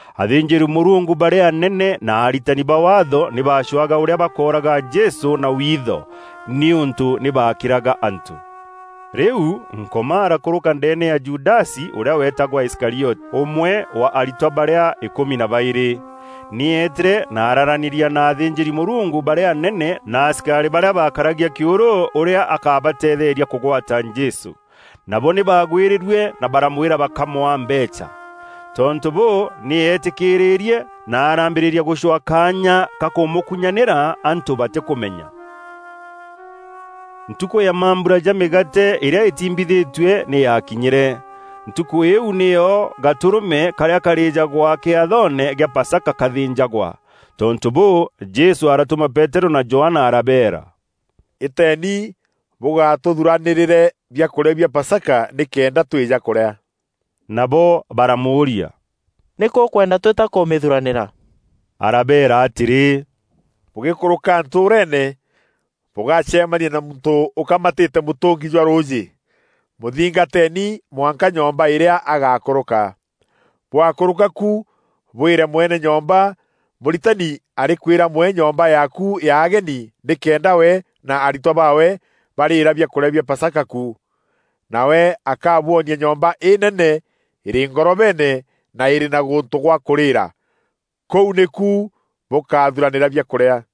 Athînjîri-Mûrungu barîa anene na aritani ba Waatho nî baacwaga ûrîa bakooraga Jesû na witho nîûntû nî baakîraga antû. Rîu Nkoma arakûrûka ndeene ya Judasi ûrîa weetagwa Iskarioti, ûmwe wa aritwa barîa îkûmi na baîrî. Nî eetîre na araaranîria na athînjîri-Mûrungu barîa anene na asikarî barîa baakaragia kîûrû, ûrîa akabateetheeria kûgwata Jesû. Nabo nî baagwîrîrue na baramwîra bakamwaa mbeecha. Tontû bûû, nî eetîkîrîrie na araambîrîria gûcwaa kaanya ka kûmûkunyanîra antû batîkûmenya. Ntukû ya mambura ja mîgaate îrîa îtiimbîthîtue nî yakinyîre. Ntukû îîu nîyo gatûrûme karîa kaarîjagwa kîathoone gîa pasaka kaathînjagwa. Tontû bûû, Jesû aratûma Peterû na Johana arabeera, “Îteeni bûgatûthuranîrîre biakûrîa bia Pasaka nîkenda twîja kûrîa.” Nabo baramûûria, “Nîkû ûkwenda twîta kûmîthuranîra?” Arabeera atîrî, “Bûgîkûrûka ntûûreene, bûgacemania na muntû ûkamatîte mûtûngi jwa rûûjî. Mûthingateeni mwanka nyomba îrîa agakûrûka. Bwakûrûka ku bwîre mwene nyomba, ‘Mûritani arîkwîra mwee nyomba yaaku ya ageni nîkenda we na aritwa baawe barîîra biakûrîa bia Pasaka ku.’ Nawe akabwonia nyomba înene îrî ngorobeene na îrî na gûntû gwa kûrîra. Kûu nîku bûkathuranîra biakûrîa.”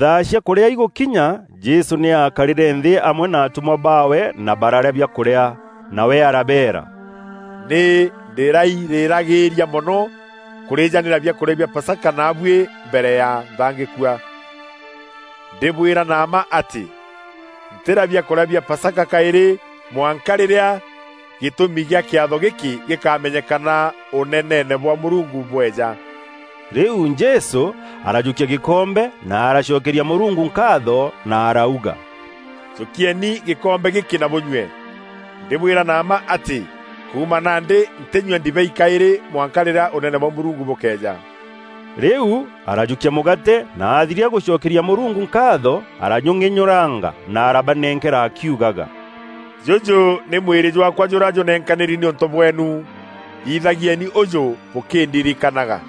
Thaa cia kûrîa igûkinya, Jesû nî aakarîre nthî amwe na atûmwa baawe na bararîa biakûrîa. Nawe arabeera, “Nî ndîrairiragîîria mono kûrîjanîra biakûrîa bia Pasaka naabuî mbere ya nthangîkua. Ndîbwîra na mma atî, ntîrîa biakûrîa bia Pasaka kaîrî mwanka rîrîa gîtûmi kîa kîatho gîkî gîkamenyekana Ûneneene bwa Mûrungu bweja.” Rîu Jesû arajûkia gîkombe, na aracokeria Mûrungu nkaatho na arauga, “Jûkieni gîkombe gîkî na bûnyûe. Ndîbwîra na mma atî kuuma nandî ntînyua ndibei kaîrî mwanka rîrîa Ûnene bwa Mûrungu bûkeeja.” Rîu arajûkia mûgaate na athiria gûcokeria Mûrungu nkaatho, arajûng'enyûranga na arabanenkera akiugaga, [“Jûjû nî mwîrî jwaakwa jûrîa jûnenkanîri nîûntû bweenu. Thithagieni ûjû bûkîndirikanaga.”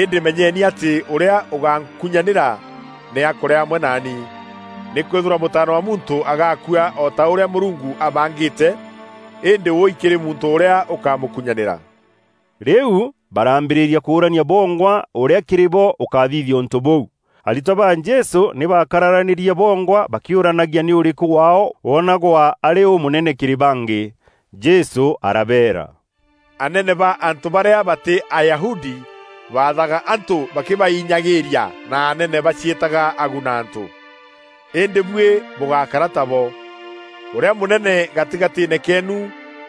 Îndî menyeni atî ûrîa ûgankunyanîra nî akûrîa amwe naani. Nîkwîthîrwa Mûtaana wa Muntû agakua o ta ûrîa Mûrungu abangîte, îndî wûûi kîrî muntû ûrîa ûkamûkunyanîra!” Rîu baraambîrîria kûûrania bongwa ûrîa kîrî bo ûkathithia ûntû bûu. Aritwa ba Jesû nî baakararanîrie bongwa bakîûranagia nî ûrîkû waao wonagwa arî ûmûnene kîrî bangî. Jesû arabeera, “Anene ba antû barîa batî Ayahudi baathaga antû bakîbainyagîîria na anene baciîtaga aguna-antû. Îndî buî bûgákara tabo. Ûrîa mûnene gatîgatîîne keenu,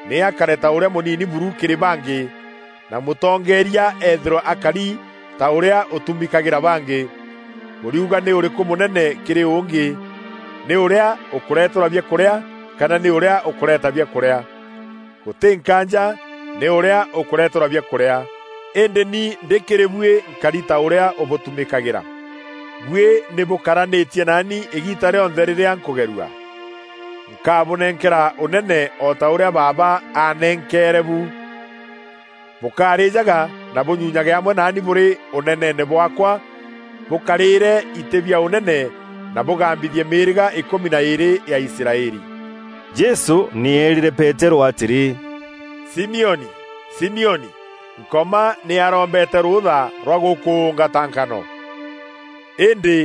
nî akare ta ûrîa mûnini buru kîrî bangî, na mûtongeeria eethîrwe akari ta ûrîa ûtumîkagîra bangî. Bûriuga nî ûrîkû mûnene kîrî ûngî: nî ûrîa ûkûreterwa biakûrîa kana nî ûrîa ûkûreeta biakûrîa? Gûtî nkaanja nî ûrîa ûkûreeterwa biakûrîa. Îndî ni ndî kîrî buî nkari ta ûrîa ûbûtumîkagîra. “Buî nî bûkaranîtie naani îgiita rîonthe rîrîa nkûgerua. Nkabûnenkera ûnene o ta ûrîa Baaba aanenkeere bu. Bûkarîjaga na bûnyunyage amwe naanî bûrî ûneneene bwaakwa bûkarîre itî bia ûnene na bûgambithie mîîrîga îkûmi na îîrî ya Israeli.” Jesû nî eerîre Peterû atîrî, “Simioni, Simioni, Nkoma nî arombete rûûtha rwa gûkûûnga ta nkano. Îndî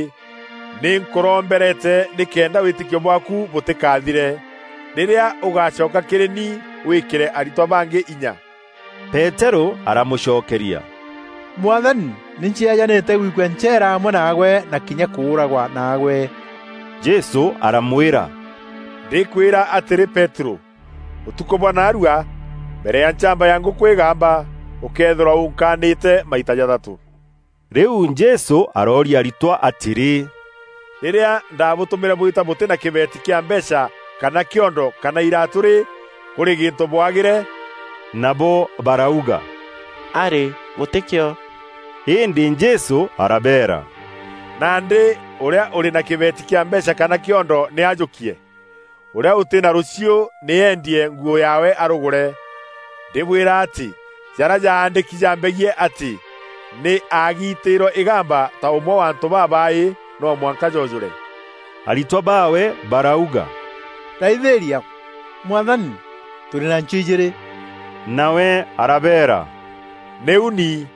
nî nkûrombereete nîkenda wîtîkio bwaaku bûtîkathire. Rîrîa ûgacoka kîrî ni wîîkîre aritwa bangî inya.” Peterû aramûcokeria, “Mwathani, nî ncieejanîte gwikua ncheera amwe naagwe na kinya kûûragwa naagwe.” Jesû aramwîra, “Ndîkwîra atîrî Peterû, ûtukû bwa naarua, mbere ya nchamba ya ngûkû îgamba, ûkeethîrwa ûnkaanîte maita jathatû.” Rîu Jesû arooria aritwa atîrî, “Rîrîa ndaabûtûmîre bwîta bûtî na kîbeeti kîa mbeecha kana kîondo kana iraatû rî, kûrî gîntû bwaagîre?” Nabo barauga, “Arî, gûtîkîo.” Îndî Jesû arabeera, “Nandî ûrîa ûrî na kîbeeti kîa mbeecha kana kîondo nî ajûkie. Ûrîa ûtî na rûchiû nî eendie nguû yaawe arûgûre. Ndîbwîra atî jarîa jaandîki jambegiî atî, ‘Nî aagiitîîrwe îgamba ta ûmwe wa antû babaaî,’ noo mwanka joojûre.” Aritwa baawe barauga, “Raithîria! Mwathani! Tûrî na nchiû ijîîrî.” Nawe arabeera, “Nîu ni.”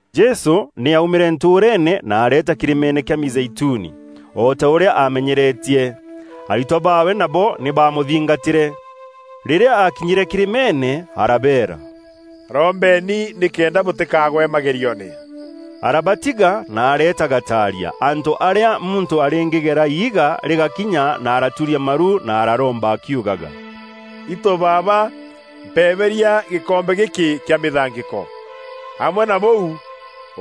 Jesû nî aumîre ntûûreene na areeta kîrîmeene kîa Mîzeituni, o ta ûrîa aamenyeretie. Aritwa baawe nabo nî baamûthingatîre. Rîrîa aakinyîre kîrîmeene arabeera, “Rombeeni nîkenda bûtîkaagwe magerioone.” Arabatiga na areeta gataaria, antû arîa muntû arîngîgeera iiga rîgakinya na araturia maru na araromba akiugaga, “Itû Baaba, mpebeeria gîkombe gîkî kîa mîthangîko. Amwe na bûu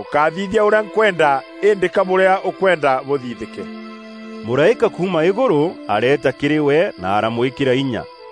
ûkáthithia ûrîa nkwenda îndî ka bûrîa ûkwenda bûthithîke.” [ Mûraîka kuuma îgûrû areeta kîrî we na aramwîkîra inya.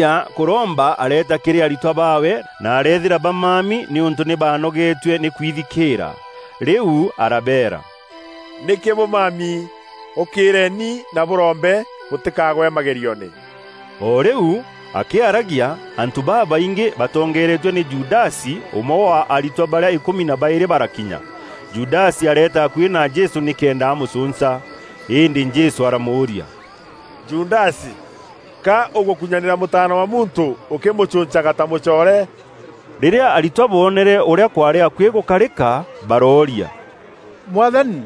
Akûthiria kûromba areeta kîrî aritwa baawe na areethîra bamami nîûntû nî baanogeetue nî kwithikîîra. Rîu arabeera, “Nîkî bûmami? Ûkîîreeni na bûrombe bûtîkagwe magerioone.” O rîu akîaragia, antû babaingî batongeeretue nî Judasi, ûmwe wa aritwa barîa îkûmi na baîrî barakinya. Judasi areeta akuî na Jesû nîkenda amûcûnca. Îndî Jesû aramûûria, “Judasi, ka ûgûkunyanîra Mûtaana wa Muntû ûkîmûcûncaga ta mûcoore?” Rîrîa aritwa boonere ûrîa kwaarî akuî gûkarîka, barooria, “Mwathani,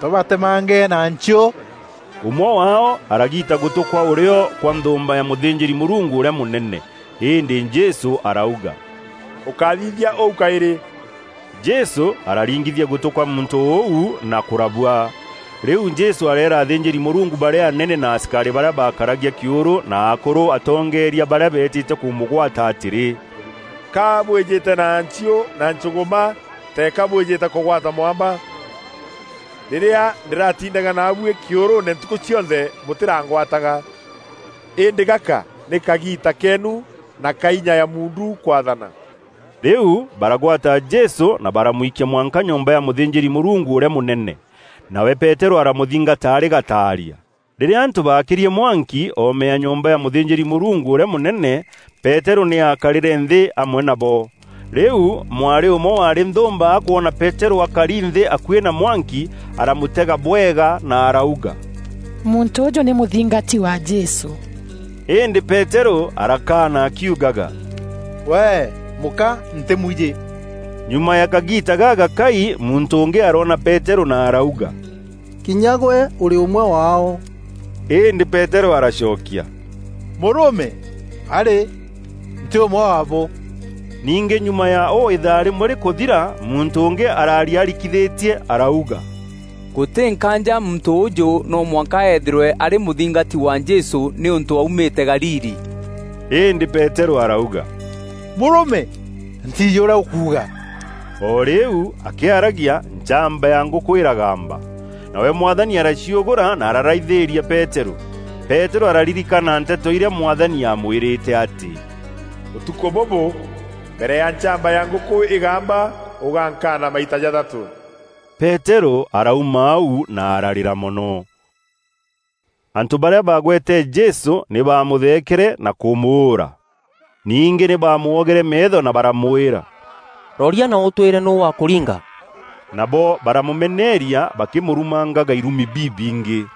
tûbatemange na nchiû?” Ûmwe waao aragiita gûtû kwa ûrîo kwa nthûûmba ya mûthînjîri-Mûrungu ûrîa mûnene. Îndî Jesû arauga, “Ûkáthithia ûû kaîrî.” Jesû araringithia gûtû kwa muntû ûu na kûrabua. Rîu Jesû areera athînjîri-Mûrungu barîa anene na asikarî barîa baakaragia kîûrû na akûrû atongeeria barîa beetîte kûmûgwata atîrî, “Ka bwîjîte na nchiû na nchûgûma teeka bwîjîte kûgwata mwamba? Rîrîa ndîratindaga naabuî kîûrûûne ntukû cionthe bûtîrangwataga. Îndî gaka nî kagiita keenu, na ka inya ya muundu kwaathana.” Rîu baragwata Jesû na baramwikia mwanka nyomba ya mûthînjîri-Mûrungu ûrîa mûnene. Nawe Peterû aramûthingata arî gataaria. Rîrîa antû baakîrie mwanki oome ya nyomba ya mûthînjîri-Mûrungu ûrîa mûnene, Peterû nî aakarîre nthî amwe nabo. Rîu mwarî ûmwe waarî nthûûmba akwona Peterû akari nthî akuî na mwanki, aramûtega bwega na arauga, “Muntû ûjû nî mûthingati wa Jesû.” Îndî Peterû arakaana akiugaga, “Wee! Mûka! Ntîmwijî.” Nyuma ya kagiita gagakai muntû ûngî aroona Peterû na arauga, “Kinya gwe ûrî ûmwe waao.” Îndî Peterû aracokia, “Mûrûme! Arî! Ntî ûmwe waabo.” Ningî nyuma ya û îthaa rîmwe rîkûthira muntû ûngî araaria arikithîtie arauga, “Gûtî nkaanja muntû ûûjû no mwanka eethîrwe arî mûthingati wa Jesû nîûntû aumîte Galili.” Îndî Peterû arauga, “Mûrûme, ntiijî ûrîa ûkuuga.” O rîu akîaragia, nchamba ya ngûkû îragamba. Nawe Mwathani araciûgûra na araraithîîria Peterû. Peterû araririkana nteto irîa Mwathani amwîrîte atî, “Ûtukû bûbû, mbere ya nchamba ya ngûkû îgamba, ûgankaana maita jathatû.” Peterû arauma au na ararîra mono. Antû barîa baagwete Jesû nî bamûthekeere na kûmûûra. Ningî nî baamwogere meetho na baramwîra, “Roria na ûtwîre nûû wakûringa?” Nabo baramûmeneeria bakîmûrumangaga irumi bibingî.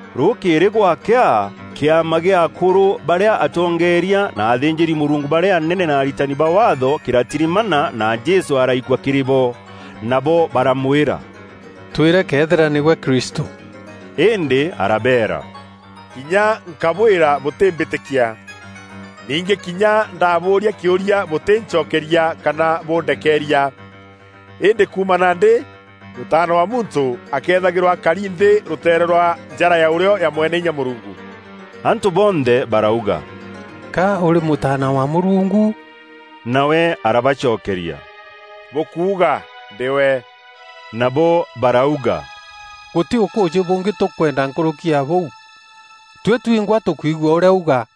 Rûkîîrî gwakea, kîama kîa akûrû barîa atongeeria na athînjîri-Mûrungu barîa anene na aritani ba Waatho kîratirimana, na Jesû araikua kîrî bo. Nabo baramwîra, “Twîre Këethîra nîgwe Kristû.” Îndî arabeera, “Kinya nkabwîra bûtîmbîtîkia. Ningî kinya ndabûûria kîûria, bûtîncokeria kana bûndekeeria. Îndî kuuma nandî Mûtaana wa Muntû akethagîrwa akari nthî rûteere rwa njara ya ûrîo ya Mweneinya Mûrungu.” Antû bonthe barauga, “Ka ûrî Mûtaana wa Mûrungu?” Nawe arabacokeria, “Bûkuuga ndî we.” Nabo barauga, “Gûtî ûkûûjî bûngî tûkwenda nkûrûki ya bûu. Tuî twingwa tûkwigua ûrîa auga.”